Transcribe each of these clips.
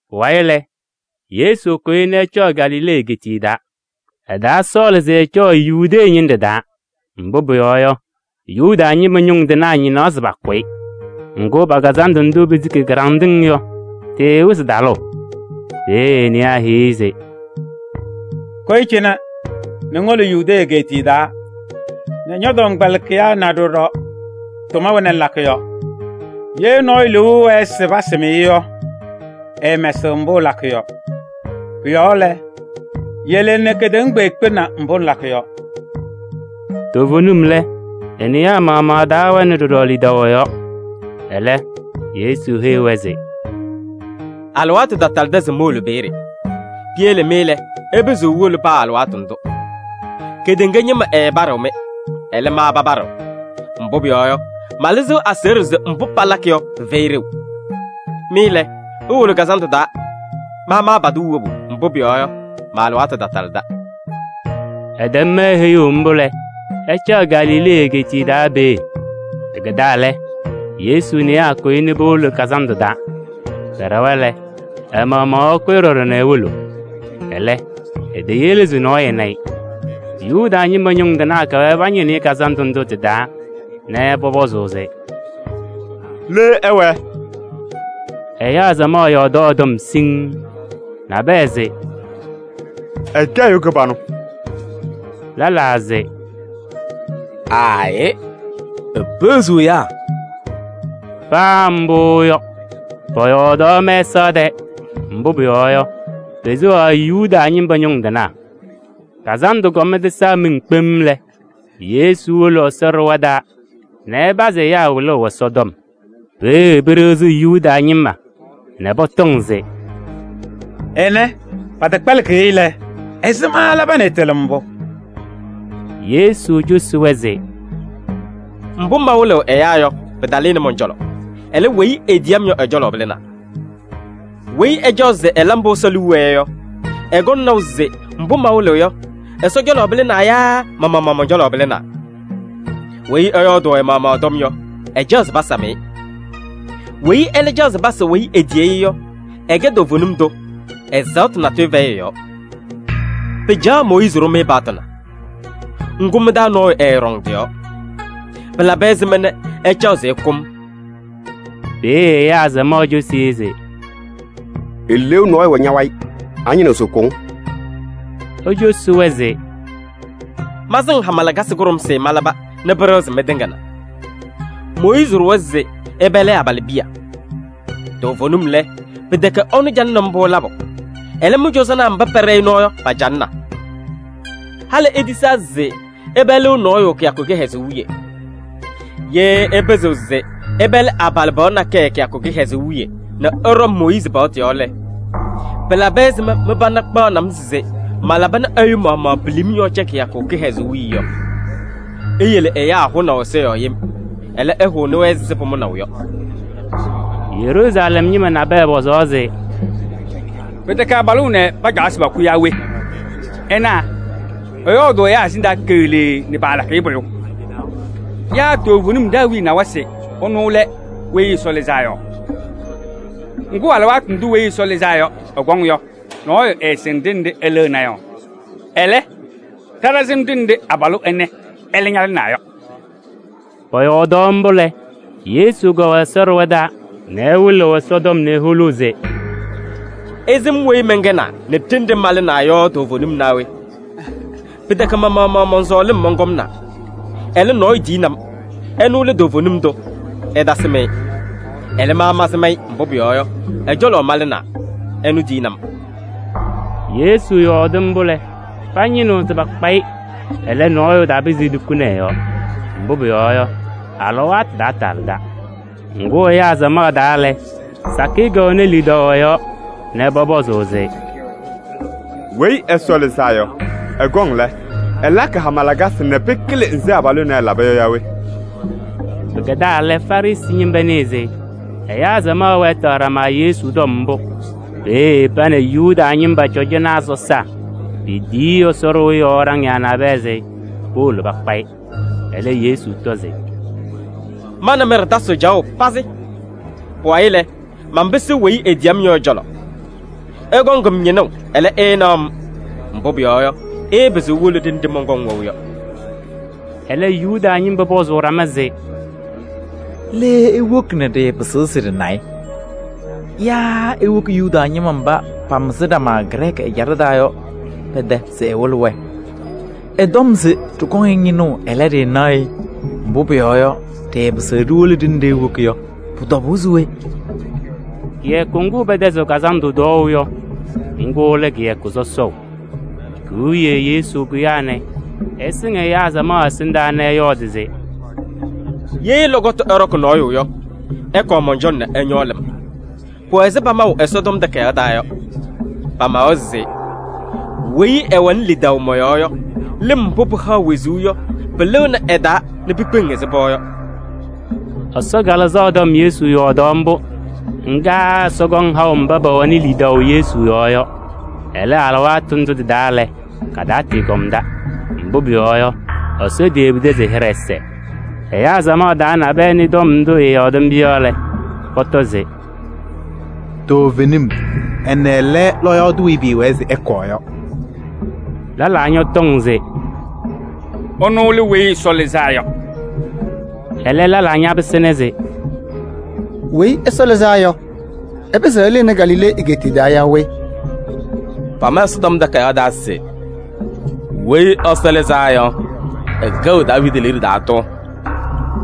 Pʋwayɩ lɛ, Yesu kʋyɩ nɛ ɛcɔʋ Galilee egeetiye taa. Ɛtaasɔɔlɩ se ɛcɔɔ Yudee ñɩnɖɛ taa, mbʋ pʋyɔɔ yɔ, Yuda ñɩma ñʋŋ tɩnaa ñɩnaɣ se pakʋ-ɩ. Ŋgʋ, pa-kazandʋ ndʋ pesiki kɩɖanɖɩŋ yɔ, tɩɩwɩzɩ talʋʋ. Peeye e-newaa heyi-i se: “Kʋyɩ cɩnɛ nɛ ŋwolo Yudee egeetiye taa nɛ ñɔ-tɔmkpɛlɩkɩyaa na ɖɔɖɔ tʋma wena ŋlakɩ yɔ. Ye nɔɔyʋ liu ɛwɛɛ se pasɩm-ɩ yɔ, ɛɛmɛsɩɣ mbʋ ɛlakɩ yɔ. Pʋ-yɔɔ lɛ, yele nɛ kedeŋa kpeekpe na mbʋ ŋlakɩ yɔ.” Toovenim lɛ, e-newaa maɣmaɣ taawɛnɩ ɖɔɖɔ lidaʋ ɛ-yɔɔ. Ɛlɛ, Yesu heyi-wɛ se: “Alɩwaatʋ tatalɩdɩ se mowolo peeye. Piyele mɩ lɛ, ɩpɩzɩɣ iwolo paa alɩwaatʋ ndʋ. Kedeŋa ñɩma ɛɛpaɖɩɣ-mɩ, ɛlɛ, ma papaɖɩɣ. Mbʋ pʋyɔɔ yɔ, malɩzɩɣ aseɣɖe se mbʋ palakɩ yɔ, pɩfɛyɩ ɖeu. Mɩ lɛ, iwolo kazandʋ taa, ma maapadɩɣ wobu, mbʋ pʋyɔɔ yɔ, ma-alɩwaatʋ tatalɩda.” Ɛtɛm-wɛ heyuu mbʋ lɛ, ɛcaɣ Galilee egeetiye taa peeye. Pɩkɛdaa lɛ, Yesu newaa kʋyɩ nɛ powolo kazandʋ taa. Pɛɖɛwa lɛ, ɛ-maɣmaɣ ɛkʋyɩ ɖɔɖɔ nɛ ewolo. Ɛlɛ, eteyele se nɔɔyʋ ɛna-ɩ. Yuda ñɩma ñʋŋ tɩnaa kɛwɛɛ pañɩnɩɣ-ɩ kazandʋ ndʋ tɩ-taa nɛ pɔpɔzʋʋ se: “Le ɛwɛɛ?” Ɛyaa samaɣ yɔɔdaɣ ɛ-tɔm siŋŋ: nabɛyɛ se: “Ɛkɛ ɛyʋ kɩbanʋ.” Lɛlaa se: “Aayɩ, epeɣziɣ ɛyaa.” Paa mbʋ yɔ, pɔyɔɔdaɣ mɛsaɣ tɛɛ, mbʋ pʋyɔɔ yɔ, peseɣaɣ Yuda ñɩma ñʋŋ tɩnaa. Kazandʋ kɔm tɩsaa miŋ kpem lɛ, Yesu wolo Ɛsɔ ɖɩɣa taa nɛ ɛpazɩ ɛyaa wɩlʋʋ Ɛsɔtɔm. Peeye pɩɖɩɣzɩ Yuda ñɩma nɛ pɔtɔŋ se: “Ɛnɛ, pɛtɛkpɛlɩkɩ-ɩ lɛ, ɛzɩma ɛlaba nɛ ɛtɩlɩ mbʋ?” Yesu cosi-wɛ se: “Mbʋ mawɩlɩɣ ɛyaa yɔ, pɩtalɩnɩ mɔn-cɔlɔ, ɛlɛ, weyi etiyi-m yɔ, ɛ-cɔlɔ pɩlɩnaa. Weyi ɛcaɣ se ɛla mbʋ Ɛsɔ liu wɛɛ yɔ, ɛkɔŋ naʋ se mbʋ mawɩlɩɣ yɔ, Ɛsɔ cɔlɔ pɩlɩnaa yaa ma-maɣmaɣ mɔn-cɔlɔ pɩlɩnaa. Weyi ɛyɔɔdʋʋ ɛ-maɣmaɣ ɛ-tɔm yɔ, ɛcaɣ se pasam-ɩ. Weyi ɛlɛ caɣ se pasa weyi etiyi-i yɔ, ɛkɛ toovenim tʋ, ɛzaɣtʋ natʋyʋ fɛyɩ ɛ-yɔɔ. Pɩcaɣaɣ Mooyiizi ɖʋ-mɩ paɣtʋ na? Ŋgʋ, mɩ-taa nɔɔyʋ ɛɛɖɔŋ tɩ-yɔɔ. Pɩlabɩ ɛzɩma nɛ ɩcaɣ se ɩkʋ-m?” Peeye ɛyaa samaɣ cosi-i se: “Eleeu nɔɔyʋ wɛ ña-wayɩ. Añɩnɩɣ se ɛkʋ-ŋ?” Ecosi-wɛ se: “Masɩŋ hama lakasɩ kʋɖʋmsɩ malaba nɛ pɩɖɩɣzɩ mɩtɩŋa na! Mooyiizi ɖʋwa se ɩpɛlɩ abalɩbiya. Toovenim lɛ, pɩtɛkɛ ɛnʋ calɩnɩ mbʋ labʋ, ɛlɛ, mɩ-cɔzɔnaa mba pɛɖɛ-ɩ nɔɔ yɔ, pacalɩna. Halɩ itisaa se ɩpɛlɩɣ nɔɔyʋ kɩyakʋ kɩhɛzʋʋ wiye. Ye ɩpɩzɩɣ se ɩpɛlɩ abalɩbɩɣa nakɛyɛ kɩyakʋ kɩhɛzʋʋ wiye nɛ ɩɖɔ Mooyiizi paɣtʋ yɔɔ lɛ, pɩlabɩ ɛzɩma mɩ-pana kpaɣnɩ-m se malaba nɛ ɛyʋ maɣmaɣ pilim yɔɔ cɛ kɩyakʋ kɩhɛzʋʋ wiye yɔ? Iyele ɛyaa hʋnaʋ ɛza yɔɔ yem. Ɛlɛ, ɩhʋnɩ-wɛ ɛzɩ pʋmʋnaʋ yɔ.” Yeruusalɛm ñɩma nabɛyɛ pɔzaɣ se: “Pɩtɛkɛ abalʋ ɛnɛ pacaɣ se pakʋ yaa we? Ɩna, ɛyɔɔdʋʋ ɛyaa ɛsɩndaa keɣlee nɛ paalakɩ-ɩ pʋyʋ! Yaa toovenim ɖa-awiya nawa se ɛnʋ lɛ Weyi Ɛsɔ Lɩzaa Yɔ? Ŋgʋ, alɩwaatʋ ndʋ Weyi Ɛsɔ Lɩzaa Yɔ ɛkɔŋ yɔ, nɔɔyʋ ɛɛsɩŋ ɖenɖe ɛlɩɣna yɔ. Ɛlɛ, ɖa ɖasɩm ɖenɖe abalʋ ɛnɛ ɛlɛ ñalɩnaa yɔ.” Pɔyɔɔdaɣ mbʋ lɛ, Yesu kɛwɛ Ɛsɔ ɖɩɣa taa nɛ ɛwɩlɩɣ Ɛsɔtɔm nɛ eholuu se: “Ɩsɩm weyi mɛnkɛnaa nɛ ɖenɖe malɩnaa yɔ toovenim naa we? Pɩtɛkɛ ma-maɣmaɣ mɔn-sɔɔlɩm mɔnkɔmnaa. Ɛlɛ, nɔɔyʋ tiyini-m, ɛnʋ lɛ toovenim tʋ, ɩtasɩm-ɩ. Ɛlɛ, ma mansɩm-ɩ, mbʋ pʋyɔɔ yɔ, ɛ-cɔlɔ malɩnaa, ɛnʋ tiyini-m.” Yesu yɔɔdɩ mbʋ lɛ, pañɩnɩɣ se pakpa-ɩ, ɛlɛ, nɔɔyʋ tapɩzɩ etukuni ɛ-yɔɔ. Mbʋ pʋyɔɔ yɔ, ɛ-alɩwaatʋ taatalɩda. Ŋgʋ ɛyaa samaɣ taa lɛ, sakɩyɛ kɛwɛnɩ lidaʋ ɛ-yɔɔ nɛ pɔpɔzʋʋ se: “Weyi Ɛsɔ Lɩzaa Yɔ, ɛkɔŋ lɛ, ɛlakɩ hama lakasɩ nɛ pɩkɩlɩ nzɩ abalʋ ɛnɛ ɛlaba yɔ yaa we?” Pɩkɛdaa lɛ, Farɩsɩ ñɩma nɩɩ se ɛyaa samaɣ wɛɛtɩɣ ɖama Yesu tɔm mbʋ. Peeye pa nɛ Yuda ñɩma cɔjɔnaa sɔsaa petiyi Ɛsɔ ɖɩɣa yɔɔ ɖaŋɩyaa nabɛyɛ se powolo pakpa-ɩ. Ɛlɛ Yesu tɔ se: “Ma nɛ mɩ ɖɩtasɩɣ caɣʋ pazɩ. Pʋwayɩ lɛ, manpɩsɩɣ weyi etiyi-m yɔ ɛ-cɔlɔ. Ɩkɔŋ-m ñɩnʋʋ, ɛlɛ, ɩɩnaɣ-m. Mbʋ pʋyɔɔ yɔ, ɩɩpɩzɩɣ iwolo ɖenɖe mɔnkɔŋ wɛʋ yɔ.” Ɛlɛ Yuda ñɩma pɔzʋʋ ɖama se: “Le ewoki nɛ ɖɩɩpɩzɩɣ se ɖɩna-ɩ? Yaa ewoki Yuda ñɩma mba pamɩzɩ ɖama Grɛɛkɩ ɛjaɖɛ taa yɔ pɛ-tɛ se ɛwɩlɩ-wɛ? Ɛtɔm se ɖɩkɔŋ-ɩ ñɩnʋʋ, ɛlɛ, ɖɩɩnaɣ-ɩ, mbʋ pʋyɔɔ yɔ, ɖɩɩpɩzɩɣ ɖiwolo ɖenɖe ewoki yɔ, pʋ-tɔbʋʋ se we?” Kɩyakʋ ŋgʋ pɛtɛzɩɣ kazandʋ tɔɔʋ yɔ, ŋgʋ lɛ kɩyakʋ sɔsɔʋ. Ki-wiye Yesu kʋyaa nɛ ɛsɩŋ ɛyaa samaɣ ɛsɩndaa nɛ ɛyɔɔdɩ se: “Ye lɔkɔtʋ ɛɖɔkɩ nɔɔyʋ yɔ, ɛkɔɔ mɔn-cɔlɔ nɛ ɛñɔɔ lɩm. Pʋwɛ ɛzɩ pamaʋ Ɛsɔtɔm Takayaɣ taa yɔ. Pamawa se: ‘Weyi ɛwɛnɩ lidaʋ mɔ-yɔɔ yɔ, lɩm mbʋ pɩhaɣ wezuu yɔ pɩlɩɣnɩ ɛ-taa nɛ pikpeŋ ɛzɩ pɔɔ yɔ.’” Ɛsɔ Kalɩzaɣ tɔm Yesu yɔɔdaɣ mbʋ. Ŋga Ɛsɔ kɔŋ haʋ mba pɛwɛɣnɩ lidaʋ Yesu yɔɔ yɔ. Ɛlɛ, alɩwaatʋ ndʋ tɩ-taa lɛ, katatɩɩkɔmda, mbʋ pʋyɔɔ yɔ, Ɛsɔ teyebidi se ɛ-hɩɖɛ ɛsɛɛ. Ɛyaa samaɣ taa nabɛyɛ nɩ tɔm ndʋ ɛyɔɔdɩ mbʋ yɔ lɛ, pɔtɔ se: “Toovenim, ɛnɛ lɛ lɔɔyaɣ tʋ weyi pɩɩwɛɛ se ɛkɔɔ yɔ!” Lɛlaa ñɔtɔŋ se: “Ɛnʋ lɛ Weyi Ɛsɔ Lɩzaa Yɔ!” Ɛlɛ lɛlaa ñapɩsɩna se: “Weyi Ɛsɔ Lɩzaa Yɔ, ɛpɩzɩɣ ɛlɩnɩ Galilee egeetiye taa yaa we? Pama Ɛsɔtɔm Takayaɣ taa se: ‘Weyi Ɛsɔ Lɩzaa Yɔ, ɛkɛɣ Daaviidi liɖe taa tʋ.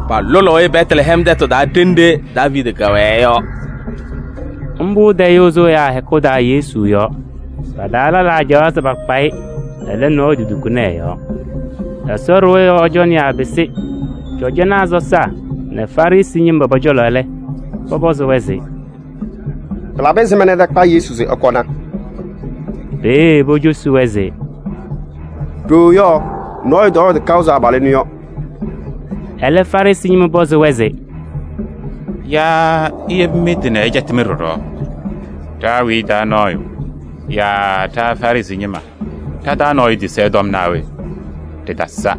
Palʋlʋʋ-ɩ Bɛtlɛhɛm tɛtʋ taa ɖenɖe Daaviidi kɛwɛɛ yɔ.’” Mbʋ tayʋʋ sʋ ɛyaa hɛkʋ taa Yesu yɔɔ. Pa-taa lɛlaa caɣaɣ se pakpa-ɩ, ɛlɛ, nɔɔyʋ totukuni ɛ-yɔɔ. Ɛsɔ ɖɩɣa yɔɔ cɔnɩyaa pɩsɩ cɔjɔnaa sɔsaa nɛ Farɩsɩ ñɩma pɔ-cɔlɔ lɛ, pɔpɔzɩ-wɛ se: “Pɩlabɩ ɛzɩma ɩtakpa Yesu se ɩkɔna?” Peeye pocosi-wɛ se: “Ɖooo yɔ, nɔɔyʋ tɔyɔɔdɩ kaʋ ɛzɩ abalʋ ɛnʋ yɔ.” Ɛlɛ Farɩsɩ ñɩma pɔzɩ-wɛ se: “Yaa iyebi mɩ-tɩ nɛ ɛcɛtɩ-mɩ ɖɔɖɔ? Ɖa-awiya taa nɔɔyʋ yaa ɖa Farɩsɩ ñɩma, ɖa-taa nɔɔyʋ tisi ɛ-tɔm naa we? Ɖɩtasa.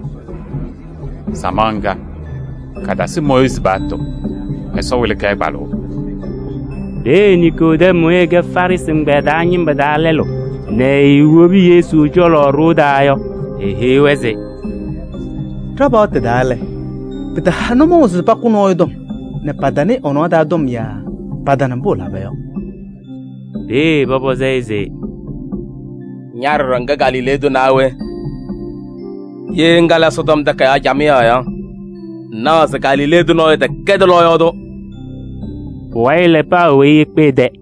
Samaɣ ŋga, katasɩ Mooyiizi paɣtʋ, Ɛsɔ wɩlɩ-kɛ kpalʋʋ!” Peeye Niikodɛm weyi ɛkɛ Farɩsɩ ɛgbɛyɛ taa ñɩma taa lɛlʋ nɛ eewobi Yesu cɔlɔ ɖoo taa yɔ, eheyi-wɛ se: “Ɖa-paɣtʋ taa lɛ, pɩtaha nʋmɔʋ se pakʋ nɔɔyʋ tɔm nɛ patanɩɩ ɛ-nɔɔ taa tɔm yaa patana mbʋ ɛlaba yɔ.” Peeye pɔpɔzɩ-ɩ se: “Ña ɖɔɖɔ ŋkɛ Galilee tʋ naa we? Ye ŋkalɩ Ɛsɔtɔm Takayaɣ camɩyɛ yɔ, ŋnaɣ se Galilee tʋ nɔɔyʋ tɛkɛdɩ lɔɔyaɣ tʋ.” [ Pʋwayɩ lɛ, paa weyi ekpe ɛ-tɛ.